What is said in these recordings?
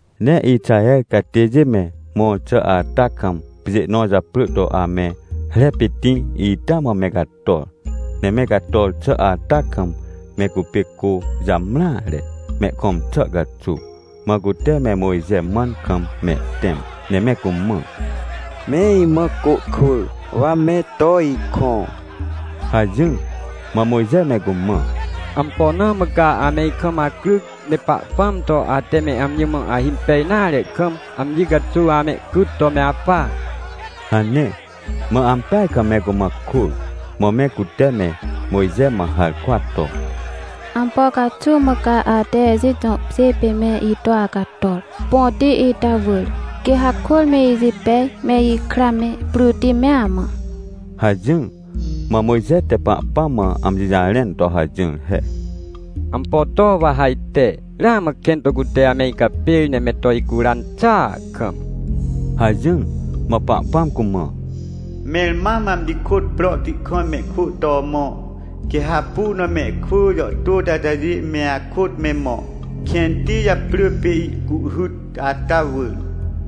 Ne Ixaher catêjê me mõr xà ata kam, pjê nõ japrỳ to ame Repitĩ ita mã me cator. Ne me cator xà ata kam me cupê cô jamreare, mehkõm xà caxuw. Mã cute me Mojxe mãn kam mehtẽm, ne me cumã: — Me imã cô kwỳ, wa me to ikõ — hajỹr. Mã Mojxe me cumã: — Ampo na mã ca ame ikam acryc, ne Pahpãm to ate me amji mã ahimpej nare kam, amji caxuw amehcyt to me apa? — hane. Mã ampeaj kam me cumã kôr, mã me cute me Mojxe mã harkwa to: — Ampo caxuw mã ca ate Ejit jõ pjê pê me ito acator, põti ita wỳr, quê hakôr me ijipej, me ikra me, pryti mea mã? — hajỹr. Mã Mojxe te Pahpãm mã amji jarẽn to hajỹr he: — Ampo to wa ha ajte? Ramã kẽn to cute ame icapêr ne me to icuran xàa kam — hajỹr. Mã Pahpãm cumã: — Mẽr mam amji kôt prohti kam mehkwỳ to mõ, quê ha hapu na mehkwỳ jàhtôti atajê me akôt me mõ, kẽnti japrỳ pê Ihcuhhyt ata wỳr.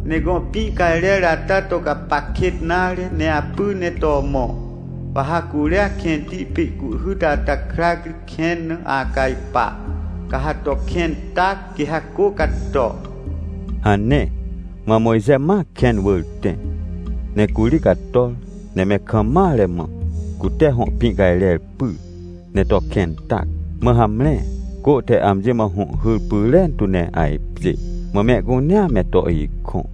Ne gõ pĩ cajrer ata to gapac kêt nare ne apy ne to mõ. Wa ha curia kẽnti pê Ihcuhhyt ata krac ri kẽn na acajpa, ca ha to kẽn tac, quê ha cô cato — hane. Mã Mojxe ma kẽn wỳr tẽ, ne curi cator. Ne me kam mare mã, cute hõ pĩ cajrer pyr, ne to kẽn tac. Mã hamre cô te amji mã hũhhyr pyrentu ne ajpjê. Mã mehcunea me to ikõ.